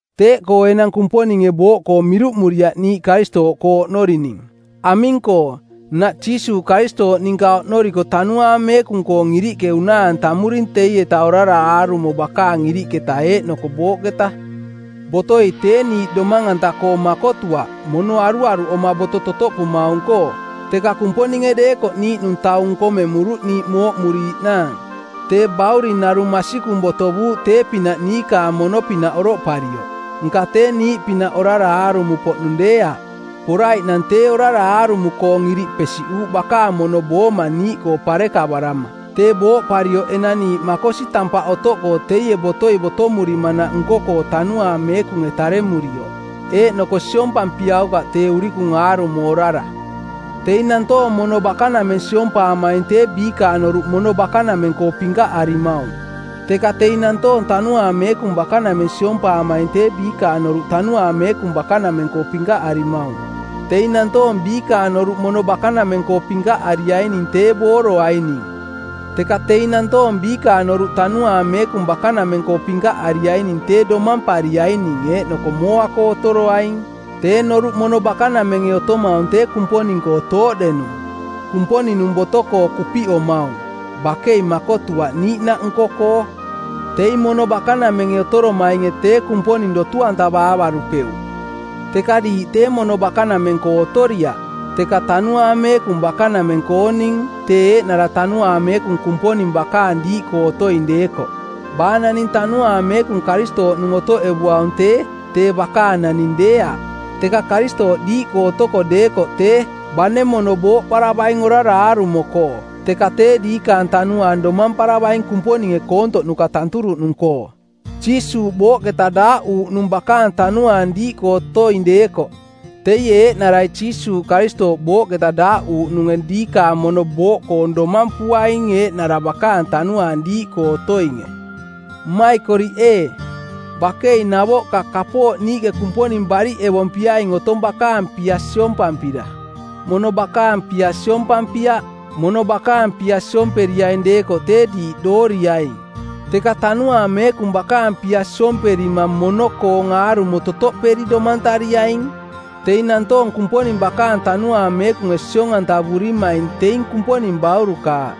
Teeꞌkoo enang Kumponinge booꞌkoo miruꞌmuriaꞌ niiꞌ Karistooꞌkoo oꞌnorining. Aming-koo, nnaꞌ Jiisuuꞌ Karistooꞌ ninka oꞌnoriko Tanuaang Meekung-koong iriꞌke unaa-antamuring teieta orara aarumo bakaang iriꞌketa eeꞌnoko booꞌketa. Botoi tee niiꞌ domang-anta-koo makotuaꞌ mono aruaruꞌoma boto totoꞌpumaung-koo. Teka Kumponinge deekoꞌ niiꞌnung taung nkomemuruꞌ niiꞌ mooꞌmuriiꞌnaang. Tee Bauring narung masikung botovuuꞌ tee-pinaꞌ niikaang mono-pinaꞌ oroꞌparioꞌ, nka tee niiꞌpinaꞌ orara aarumo-poꞌnung deeaꞌ. Poraiꞌnang tee orara aarumo-koong iriꞌ pesiꞌuuꞌ bakaang mono booma niiꞌkoo parekavarama. Tee booꞌparioꞌ enang niiꞌ makosi tampaꞌ otoꞌkoo teie botoi botomurimanaꞌ nko-koo Tanuaang Meekunge taremurioꞌ, eeꞌnoko siompampiaukaꞌ tee urikung aarumo orara. Teing nantoong mono bakanameng siompaamaing tee biikaang noruꞌ mono bakanameng-koo pinkaꞌarimaung. Teka teing nantoong Tanuaang Meekung bakanameng siompaamaing tee biikaang noruꞌ Tanuaang Meekung bakanameng-koo pinkaꞌarimaung. Teing nantoong biikaang noruꞌ mono bakanameng-koo pinkaꞌariaining tee booroaining. Teka teing nantoong biikaang noruꞌ Tanuaang Meekung bakanameng-koo pinkaꞌariaining tee domampariaing eeꞌnoko mooa-koo otoroaing. Tee noruꞌ mono bakanamenge otomaung tee Kumponing-koo tooꞌdenung, Kumponing-nung boto-koo kupiꞌomaung, bakei makotuaꞌ niiꞌnaꞌ nko-koo. Teing mono bakanamenge otoromainge tee Kumponing dotu-antavaavarupeuꞌ. Teka diiꞌ tee mono bakanameng-koo otoriaꞌ, teka Tanuaang Meekung bakanameng-kooning, tee eeꞌnara Tanuaang Meekung Kumponing bakaang diiꞌkoo otoing deekoꞌ. Baa naning Tanuaang Meekung Karistooꞌnung otoꞌevuaung tee, tee bakaang naning deeaꞌ. Teka Karistooꞌ diiꞌkoo otoko deekoꞌ tee, bane mono booꞌparavaing orara aarumo-koo, teka tee diikaang tanuaang domamparavaing Kumponinge koontoꞌnuka tanturuꞌnung-koo. Jiisuuꞌ booꞌketa daaꞌuuꞌnung bakaang Tanuaang diiꞌkoo otoing deekoꞌ teie eeꞌnarai Jiisuuꞌ Karistooꞌ booꞌketa daaꞌuuꞌnunge diikaang mono booꞌkoong domampuaing eeꞌnara bakaang Tanuaang diiꞌkoo otoinge. Mmaikoriꞌ ee, bakei navoꞌka kapooꞌ niiꞌke Kumponing bariꞌevompiaing otong bakaang pia siompampira, mono bakaang pia siompampiaꞌ. Mono bakaang pia siomperiaing deekoꞌ tee diiꞌ dooriaing. Teka Tanuaang Meekung bakaang pia siomperima mono-koong aarumo totoꞌperi domantariaing. Teing nantoong Kumponing bakaang Tanuaang Meekunge siong-antavurimaing teing Kumponing baurukaaꞌ.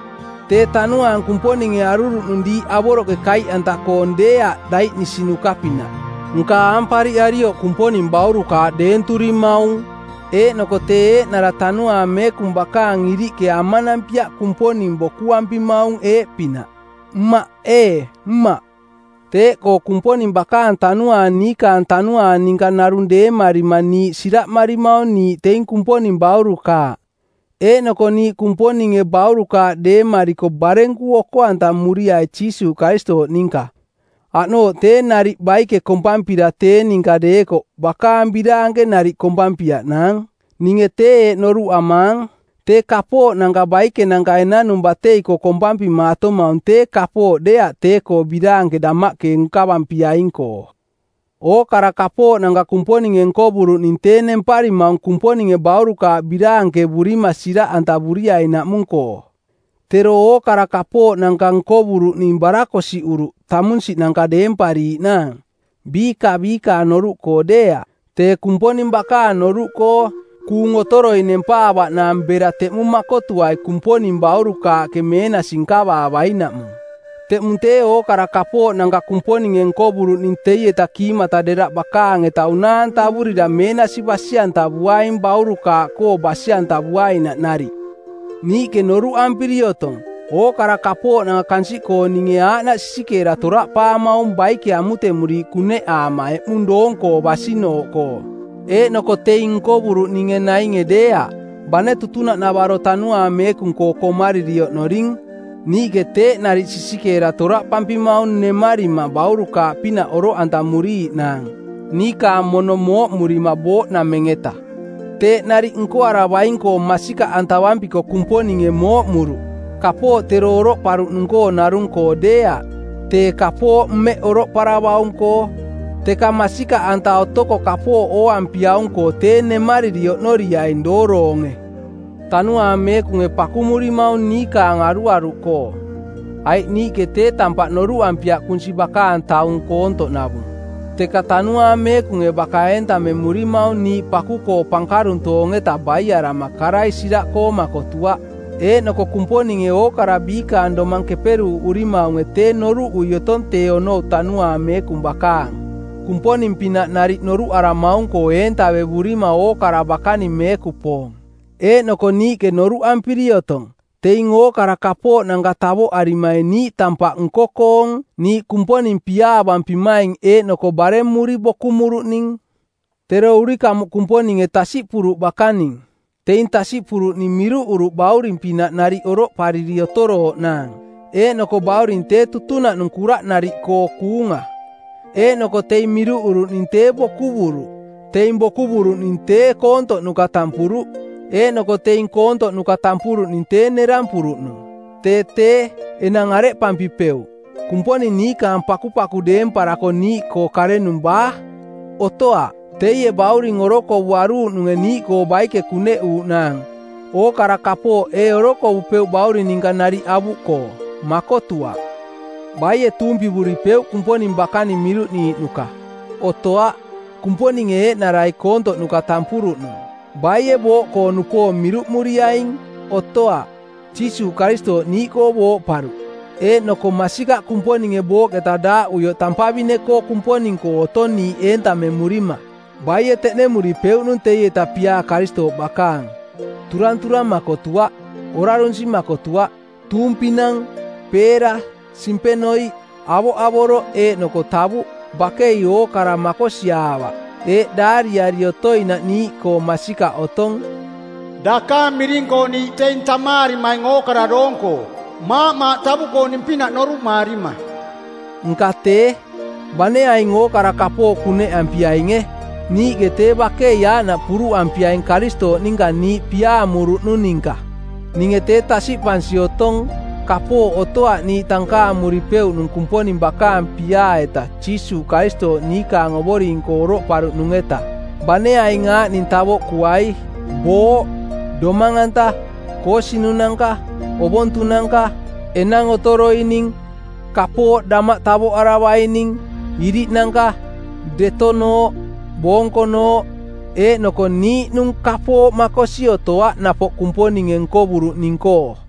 Tee Tanuaang Kumponinge aruruꞌnung diiꞌ avoroꞌke kaiꞌanta-koong deeaꞌ daiꞌnisinuka-pinaꞌ. Nka aampariꞌarioꞌ Kumponing baurukaaꞌ deenturimaung, eeꞌnoko tee eeꞌnara Tanuaang Meekung bakaang iriꞌke amanampiaꞌ Kumponing bokuampimaung eeꞌpinaꞌ: Mmaꞌ ee, Mmaꞌ. Teeꞌkoo Kumponing bakaang Tanuaang niikaang tanuaang ninka narung deemarima niiꞌ siraꞌmarimaung niiꞌ teing Kumponing baurukaaꞌ. Eeꞌnoko niiꞌ Kumponinge baurukaaꞌ deemariko barenku oko-antamuriai Jiisuuꞌ Karistooꞌ ninka, aꞌnooꞌ tee nariꞌ baike kompampira tee ninka deekoꞌ bakaang biraanke nariꞌ kompampiaꞌnaang. Ninge tee eeꞌ noruꞌamaang: Tee kapooꞌnanka baikenanka enanung batei-koo kompampimaatomaung tee kapooꞌ deeaꞌ tee-koo biraanke damaꞌke nkavampiaing-koo. Ookara kapooꞌnanka Kumponinge nkovuruꞌning tee nemparimaung Kumponinge baurukaaꞌ biraankevurima siraꞌantavuriainaꞌmung-koo. Tero ookara kapooꞌnanka nkovuruꞌning barakosiꞌuruꞌ tamunsiꞌnanka deempariiꞌnaang, biiꞌka biikaang noruꞌkoo deeaꞌ, tee Kumponing bakaang noruꞌkoo, kuung otoroi nempaavaꞌnaang bera teꞌmung makotuai Kumponing baurukaaꞌke meenasi nkavaavainaꞌmung. Teꞌmung tee ookara kapooꞌnanka Kumponinge nkovuruꞌning teieta kiimata deraꞌ bakaang-eta unaa-antavurira meenasi basi-antavuaing baurukaaꞌkoo basi-antavuainaꞌ nariꞌ. Niiꞌke noruꞌampiri otong ookara kapooꞌnanka kansiꞌkooninge aaꞌnaꞌ sisikeera toraꞌpaamaung baike amutemuriiꞌ kuneꞌaama eꞌmung doong-koo basinooꞌkoo. Eeꞌnoko teing nkovuruꞌninge nainge deeaꞌ. Bane tutunaꞌnavaro Tanuaang Meekung-koo komariri oꞌnoring, niiꞌke teeꞌ nariꞌ tee sisikeera toraꞌpampimaung nemarima baurukaaꞌpinaꞌ oroꞌantamuriiꞌnaang, niikaang mono mooꞌmurima booꞌnameng-eta. Teeꞌ nariꞌ nkoaravaing-koo masikaꞌantavampiko Kumponinge mooꞌmuruꞌ, kapooꞌ tero oroꞌparuꞌnung-koo narung-koo deeaꞌ, tee kapooꞌ mmeꞌ oroꞌparavaung-koo. Teka masikaꞌanta otoko kapooꞌ ooampiaung-koo tee nemariri oꞌnoriaing dooroonge. Tanuaang Meekunge pakumurimaung niikaang aruaruꞌkoo. Aiꞌ niiꞌke tee tampaꞌ noruꞌampiaꞌ kunsi bakaang taung koontoꞌnavung. Teka tanuaang Meekunge baka eentamemurimaung niiꞌ paku-koo pankaruntoong-eta baiarama karai siraꞌkoo makotuaꞌ. Eeꞌnoko Kumponinge ookara biikaang domang keperuuꞌurimaunge tee noruꞌui otong tee onou Tanuaang Meekung bakaang, Kumponing-pinaꞌ nariꞌ noruꞌaramaung-koo eentavevurima ookara bakaning meekupoong. Eeꞌnoko niiꞌke noruꞌampiri otong teing ookara kapooꞌnanka tavoꞌarimaing niiꞌ tampaꞌ nko-koong niiꞌ Kumponing piaavampimaing eeꞌnoko baremuri bokumuruꞌning. Tero urikamuꞌ Kumponinge tasiꞌpuruꞌ bakaning. Teing tasiꞌpuruꞌning miruꞌuruꞌ bauring-pinaꞌ nariꞌ oroꞌpariri otorooꞌnaang. Eeꞌnoko bauring tee tutunaꞌnung kuraꞌnariꞌkoo kuunga. Eeꞌnoko teing miruꞌuruꞌning tee bokuvuruꞌ. Teing bokuvuruꞌning tee koontoꞌnuka tampuruꞌ, eeꞌnoko teing koontoꞌnuka tampuruꞌning tee nerampuruꞌnung. Tee tee, enang areꞌpampipeuꞌ? Kumponing niikaang pakupaku deemparako niiꞌkoo karenung baa? Otoaꞌ. Teie bauring orokovuaruuꞌnunge niiꞌkoo baike kuneꞌuuꞌnaang, ookara kapooꞌ ee orokovupeuꞌ bauring ninka nariꞌ avuꞌkoo? Makotuaꞌ. Baie tuumpivuripeuꞌ Kumponing bakaning miruꞌniiꞌnuka? Otoaꞌ. Kumponinge eeꞌnarai koontoꞌnuka tampuruꞌnung. Baie booꞌkoo-nupoong miruꞌmuriaing? Otoaꞌ. Jiisuuꞌ Karistooꞌ niiꞌkoo booꞌparuꞌ, eeꞌnoko masikaꞌ Kumponinge booꞌketa daaꞌuioꞌ tampavine-koo Kumponing-koo otong niiꞌ eentamemurima. Baie teꞌnemuripeuꞌnung teieta piaa Karistooꞌ bakaang? Turanturang makotuaꞌ, orarunsi makotuaꞌ, tuumpinang, peera, simpenoiꞌ, avoꞌavoroꞌ eeꞌnoko tavuꞌ, bakei ookara makosiaavaꞌ. Eeꞌ daariari otoinaꞌ niiꞌkoo masikaꞌ otong, “Dakaang miring-koo niiꞌ teing tamaarimaing ookara doong-koo, maaꞌmaaꞌ tavuꞌkooning-pinaꞌ noruꞌmaarima.” Nka tee, bane aing ookara kapooꞌ kuneꞌampiainge niiꞌke tee bakei aaꞌnaꞌ puruꞌampiaing Karistooꞌ ninka niiꞌ piaamuruꞌnung ninka. Ninge tee tasiꞌpansi otong kapooꞌ otoaꞌ niiꞌ tankaamuripeuꞌnung Kumponing bakaang piaa-eta Jiisuuꞌ Karistooꞌ niikaang Ovoring-koo oroꞌparuꞌnung-eta, bane aing aaꞌning tavoꞌkuai: booꞌ, domang-anta, koosinunanka, ovontunanka, enang otoroining, kapooꞌ damaꞌ tavoꞌaravaining, iriꞌnanka, detonooꞌ, boonkonooꞌ; Eeꞌnoko niiꞌnung kapooꞌ makosi otoaꞌ napoꞌ Kumponinge nkovuruꞌning-koo.